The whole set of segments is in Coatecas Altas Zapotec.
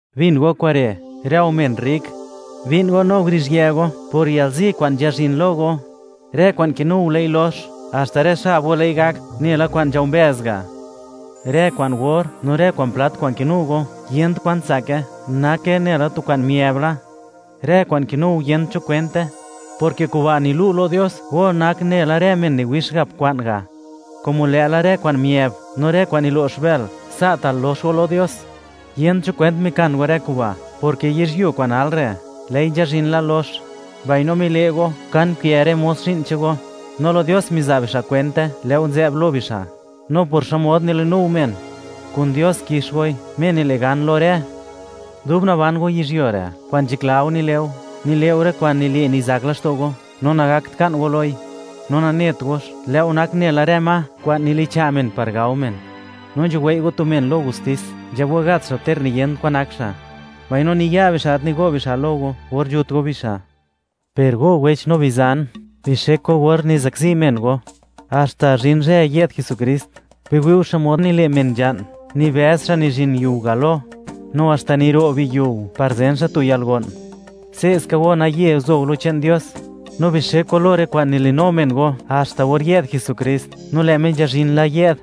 Bin go kure', rë go men rrik: Bi'n go no guruzhië go por yalzi kwa'n nzhazhin lo go. Rë kwa'n kinu go lë'i lox; haxta rë xab go lë'i gak nela kwa'n nzhao mbëz ga'. Rë kwa'n or no rë kwa'n plat kwa'n kinu go yent kwan tsake, nake nela tu kwa'n miëb la; rë kwa'n kinu go yent cho kwente, porke kuba' nilu' lo Dios go nak nela rë men niwix gap kwa'n ga'; komo lë'la rë kwa'n miëb no rë kwa'n nilo'x bël, sa'ta' lox go lo Dios. Yent cho kwent mikan go rë kuba', porke yizhyuo kwa'n nal re', lë'i nzhazhin la lox. Mbaino mile' go, ka nkë rë mos zhi'n che'n go, no lo Dios miza' bixa' kwente, lë' go nzë'b lo bixa'. No por xmod nili'nu go men, kun Dios kix goi, Dios Me nile' gan lo rë. Dub naban go yizhyuo re', kwa'n nzhakla go nile' go, nile' go rë kwa'n nile' nizak laxto' go, no nagakt ka'n go loi; no nanet gox, lë' go nak nela rë ma kwa'n nilicha' men par gao men. No nzhuwei' go tu men lo gustis, nzhab go gat xa' ter niyent kwan nak xa', mbaino niya' bixa' gat nigo' bixa' lo go or nzhut go bixa'. Per rë go wech no bizan, bixek go or nizakzi men go, haxta zhin zhë yë'd Jesukrist. Biwi' go xmod nile' men nzha'n, nibëz xa' nizhin yiu galo no haxta niro' biyiu, par zen xa' tu yalgo'n. Se'ska go naye guzo go lo che'n Dios, no bixek go lo rë kwa'n nilinu men go haxta or yë'd Jesukrist, no lë' Me nzhazhin la yë'd.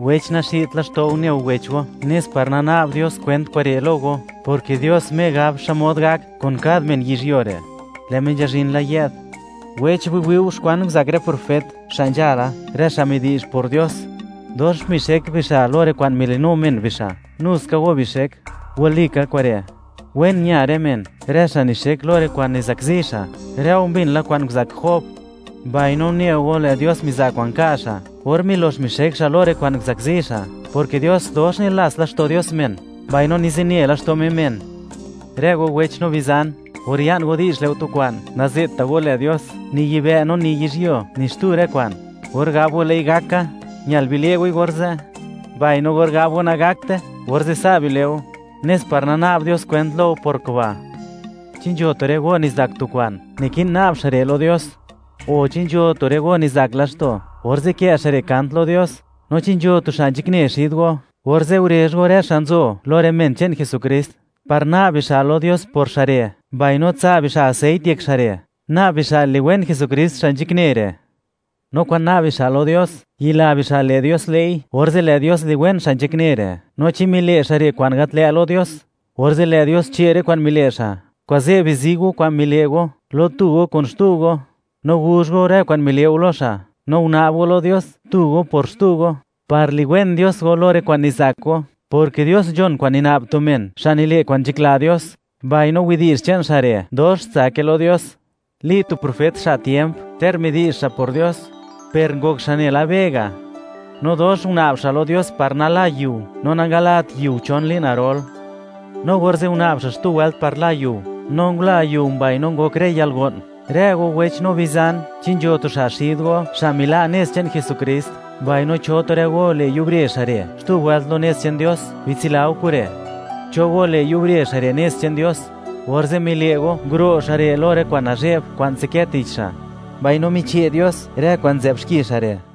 Wech, naxi'dt laxto' go (nayant laxto' go) ne go wech go, nes par nana'b Dios kwent kure' lo go, porke Dios Me gab xmod gak kun kad men yizhyuo re', lë' Me nzhazhin la yë'd. Wech, biwi' go xkwan nguzak rë profet xa' nzhala, rë xa' midi'zh por Dios; dox mixek bixa' lo rë kwa'n mili'nu men bixa'. Nuska go bixek. Walika kure', wen ña rë men, rë xa' nixek lo rë kwa'n nizakzi xa'. Rë go mbin la kwan nguzak Job, mbaino une go, lë' Dios miza' kwa'n ka' xa' or milox mixek xa' lo rë kwa'n nguzakzi xa', porke Dios dox nilats Dios laxto' men, mbaino nizine laxto' Me men. Rë go wech no bizan, or ya'n go di'zh le' go tu kwa'n, naze'tta' go lë Dios, ni yibë' no ni yizhyuo, no ni xtu rë kwa'n. Or gab go: “Lë'i gak ka”, ñal bile' goi orze'; mbaino or gab go: “Nagakte”, orze' sa' bile' go, nes par nana'b Dios kwent lo go por kuba'. ¿Chi nzho tu rë go nizak tu kwa'n? Niki'n na'b xa' re' lo Dios. O, ¿chi nzho tu rë go nizak laxto'? Orze' kë' xa' re' kant lo Dios. ¿No chi nzho tu xa' nzhakne xid go? Orze' gurezh go rë xa' nzo lo rë men che'n Jesukrist, par na'b bixa' lo Dios por xa' re', mbaino tsa' bixa' aseit yek xa' re', na'b bixa' liwen Jesukrist xa' nzhakne re'. No kwa'n na'b bixa' lo Dios, yila bixa' lë' Dios le'i, orze' lë' Dios liwen xa' nzhakne re'; no chi mile' xa' re' kwa'n gat lë' lo Dios, orze' lë' Dios che' rë kwa'n mile' xa'. Kuze', bizi go kwan mile' go lo tu go kun xtu go, no guzh go rë kwa'n mile' go lo xa'; no una'b go lo Dios tu go por xtu go, par liwen Dios go lo rë kwa'n nizak go, porke Dios nzhon kwa'n nina'b tu men xa' nile' kwa'n nzhakla Dios, mbaino widi'zh che'n xa' re', dox tsake lo Dios. Li, tu profet xa' tiemp, ter midi'zh xa' por Dios, per ngok xa' nela be ga'; no dox una'b xa' lo Dios par nala yiu, no nangalat yiu chon li'n garol. No orze' una'b xa' xtu wëlt par la yiu, no ngula yiu mbaino ngok rë yalgo'n. Rë go wech no bizan, chi nzho tu xa' xid go, xa' mila' nez che'n Jesukrist, mbaino cho tu rë go le' yubre xa' re' xtu wëlt lo nez che'n Dios, bitsila go kure', cho go le', yubre xa' re' nez che'n Dios, orze' mile' go, nguro' xa' re' lo rë kwa'n nazhe'b kwa'n nzadkë tich xa', mbaino miche' Dios rë kwa'n nzë'b xki xa' re'.